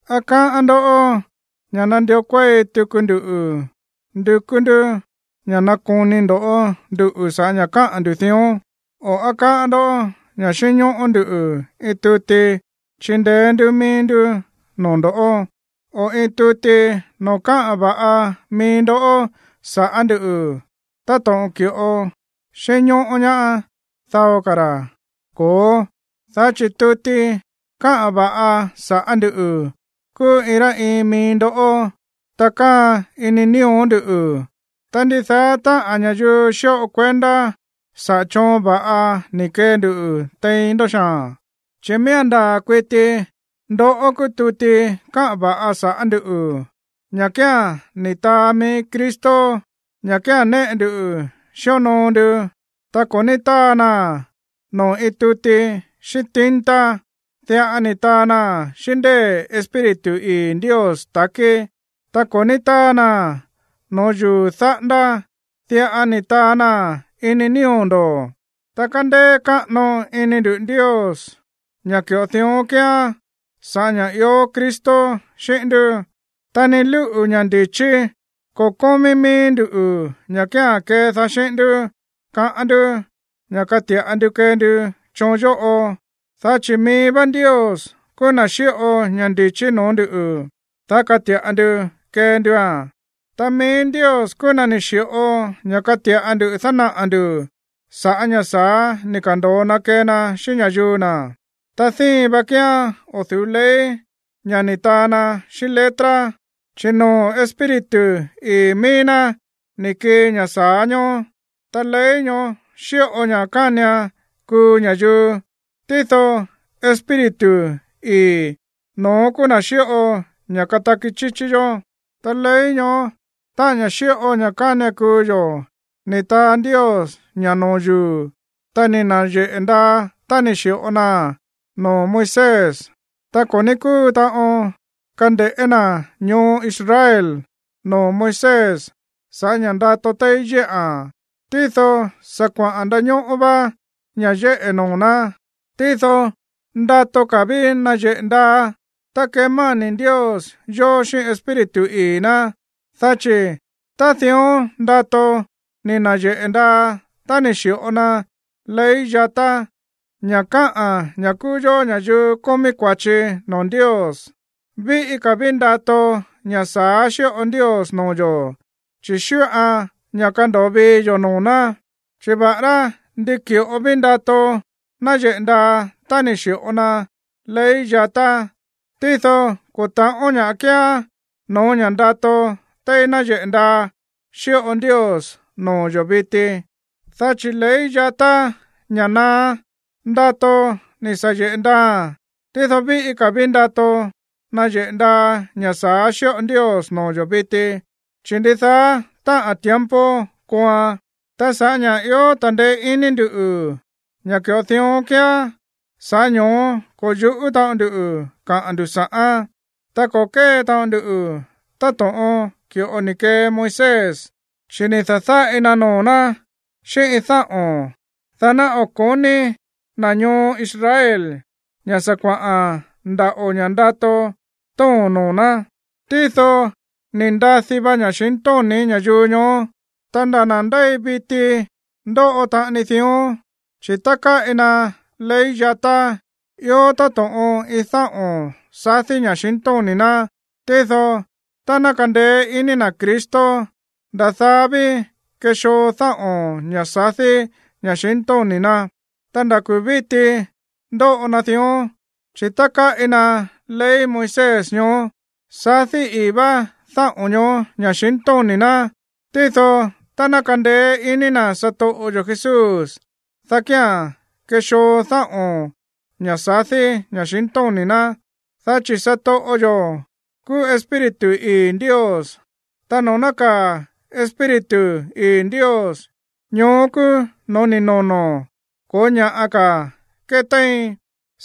¿Á káꞌán ndó ña̱ nandió kuéi tuku nduꞌu̱ ndukú ndú ña̱ nakoni ndo̱ nduꞌu̱ sa̱ꞌá ña̱ káꞌa̱n ndu̱ dión? O, ¿á káꞌán ndó ña̱ xínñóꞌó ndú iin tuti chindeé ndú mií ndú noo̱ ndo̱ꞌó, o iin tuti noo̱ káꞌa̱n va̱ꞌa mií ndó sa̱ꞌá ndu̱ táto̱ꞌon ki̱ꞌo xínñóꞌó ñaá dao ka̱ ra̱? Ko̱ó, dá chi̱ tuti káꞌa̱n va̱ꞌa saꞌa̱ ndú kúú iin rá iin mií ndoꞌó, ta káa̱a̱n ini nío̱ ndú. Ta ndidaá táꞌa̱n ña̱yuu xíꞌo kuendá saꞌa̱ choon va̱ꞌa ni̱ kee ndu tein ndó xaa̱n, chi̱ miía̱n ndaa̱ kuiti ndoꞌó kúú tuti káꞌa̱n va̱ꞌa sa̱ꞌá nduꞌu̱, ña̱ kía̱n ni̱ taa mií Cristo, ña̱ kía̱n néꞌe ndu xíonoo ndu. Ta ko̱ ní táa naa̱n noo̱ iin tuti xíꞌín tinta. Diꞌa ni̱ taa naa̱n xíꞌín ndée̱ Espíritu ii̱ Ndios ta̱kí. Ta ko̱ ní táa naa̱n noo̱ yuu̱ dáꞌándá, diꞌa ni̱ taa naa̱n ini nío̱ ndo̱. Ta kándéé káꞌano ini nduꞌu̱ Ndios ña̱ ki̱ꞌo dión kíán sa̱ꞌá ña̱ ió Cristo xíꞌín ndú. Ta ni lúꞌu̱ ña̱ ndi̱chí ko̱ kómí míí nduꞌu̱ ña̱ kía̱n kédaá xíꞌín ndú kaꞌán ndú ña̱ kati̱ꞌa ndu kee ndu choon yóꞌo, dá chi̱ mií vá Ndios kúú na̱ xíꞌo ña̱ ndi̱chí no̱ó ndu̱, dá kati̱ꞌa ndu kee ndua̱n. Ta mií Ndios kúú na̱ ni̱ xi̱ꞌo ña̱ káti̱ꞌa ndu dánaꞌa̱ ndu̱ sa̱ꞌá ña̱ sa̱á ni̱ ka̱ndo̱o na kee na xíꞌín ña̱yuu na̱. Ta díin va kíán o̱ du̱ú ley, ña̱ ni̱ taa na xíꞌín letra, chi̱ noo̱ Espíritu ii̱ míí ná ni̱ kii ña̱ sa̱á ñoó. Ta ley ñoó xíꞌo ña̱ kánian kuu ña̱yuu, tído Espíritu ii̱, no̱ón kúú na̱ xíꞌo ña̱ kataki chíchí yó. Ta ley ñoó, táꞌa̱n ña̱ xíꞌo ña̱ kánian kuu yo̱, ni̱ taa Ndios ña̱ no̱ó yuu̱. Ta ni̱ na̱yeꞌe̱ ndaa tá ni̱ xi̱ꞌo naa̱n noo̱ Moisés. Ta ko̱ ní kúu taꞌon kande̱ꞌé na̱ ñoo Israel noo̱ Moisés sa̱ꞌá ña̱ ndato téí yéꞌa̱n, tído sa̱ kuaꞌa̱n ndañóꞌó vá ña̱ yéꞌe̱ noo̱ ná. Tído ndato ka̱ ví nayeꞌe̱ ndaa tá kemáni̱ Ndios yo̱ xíꞌín Espíritu ii̱ ná. Dá chi̱ tá dión ndato ni̱ na̱yeꞌe̱ ndaa tá ni̱ xi̱ꞌo na ley yatá, ña̱ káꞌa̱n ña̱ kúú yó ña̱yuu kómí kua̱chi noo̱ Ndios, víꞌí ka̱ ví ndato ña̱ sa̱á xíꞌo Ndios noo̱ yo̱, chi̱ xíꞌoan ña̱ kando̱o vii yo̱ noo̱ ná. Chi̱ va̱ꞌará ndi ki̱ꞌo ví ndato náyeꞌe̱ ndaa tá ni̱ xi̱ꞌo na ley yatá, tído ko̱ ta̱ꞌón ña̱ꞌa kíán no̱ó ña̱ ndato téí náyeꞌe̱ ndaa xíꞌo Ndios noo̱ yo̱ viti. Dá chi̱ ley yatá, ña̱ naá, ndato ni̱ sa̱ yeꞌe̱ ndaaa̱n, tído víꞌí ka̱ ví ndato náyeꞌe̱ ndaa ña̱ sa̱á xíꞌo Ndios noo̱ yo̱ viti, chi̱ ndidaá táꞌa̱n tiempo kooan. Ta sa̱ꞌá ña̱ ió ta̱ndeé iní ndu̱ ña̱ ki̱ꞌo dión kíán, sa̱ꞌá ño̱ó ko̱ yu̱ꞌú taꞌon ndu kaꞌa̱n ndu̱ sa̱ꞌán, ta ko̱ kée taꞌon ndu táto̱ꞌon ki̱ꞌo ni̱ kee Moisés, chi̱ ni̱ da̱dáꞌi na noo̱ ná xíꞌín iin dáꞌo̱n, dá ná o̱ ko̱ní na̱ ñoo Israel ña̱ sa̱ kuaꞌa̱n ndaꞌo̱ ña̱ ndato tóo̱n noo̱ ná. Tído ni̱ ndadi va ña̱xintóni̱ ña̱yuu ñoó. Ta nda̱ na̱ ndéi viti ndóꞌo taꞌani dión, chi̱ tá káꞌi na ley yatá, ió táto̱ꞌon iin dáꞌo̱n sadí ña̱xintóni̱ ná. Tído tá ná kandeé iní na̱ Cristo, nda̱ daá ví kexoo dáꞌo̱n, ña̱ sadí ña̱xintóni̱ ná. Ta nda̱ kuu̱ víti ndóꞌo na dión, chi̱ tá káꞌi na ley Moisés ñoó, sadí ii̱ vá dáꞌo̱n ñoó ña̱xintóni̱ ná. Tído tá ná kandeé iní na̱ satoꞌo yo̱ Jesús, dá kía̱n kexoo dáꞌo̱n, ña̱ sadí ña̱xintóni̱ ná. Dá chi̱ satoꞌo yo̱ kúú Espíritu ii̱ Ndios, ta noo̱ nákaa̱ Espíritu ii̱ Ndios, ñoó kúú no̱ó ni̱ nono̱, ko̱ó ña̱ꞌa ka̱ ketéin.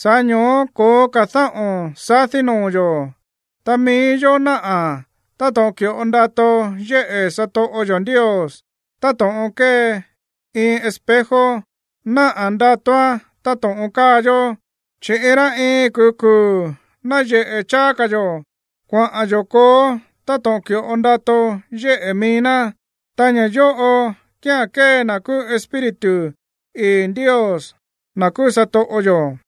Sa̱ꞌá ño̱ó ko̱ó ka̱ dáꞌo̱n sadí noo̱ yo̱, ta mií yó náꞌa̱ táto̱ꞌon ki̱ꞌo ndato yéꞌe̱ satoꞌo yo̱ Ndios, táto̱ꞌon kée iin espejo náꞌa̱ ndatoán táto̱ꞌon káa yó. Chi̱ iin rá iin kuu̱ kuu̱ náyeꞌe̱ cháá ka̱ yo̱ kuaꞌa̱n yo̱ kooó táto̱ꞌon ki̱ꞌo ndato yéꞌe̱ mií ná, ta ña̱ yóꞌo kía̱n kée na̱ kúú Espíritu ii̱ Ndios, na̱ kúú satoꞌo yo̱.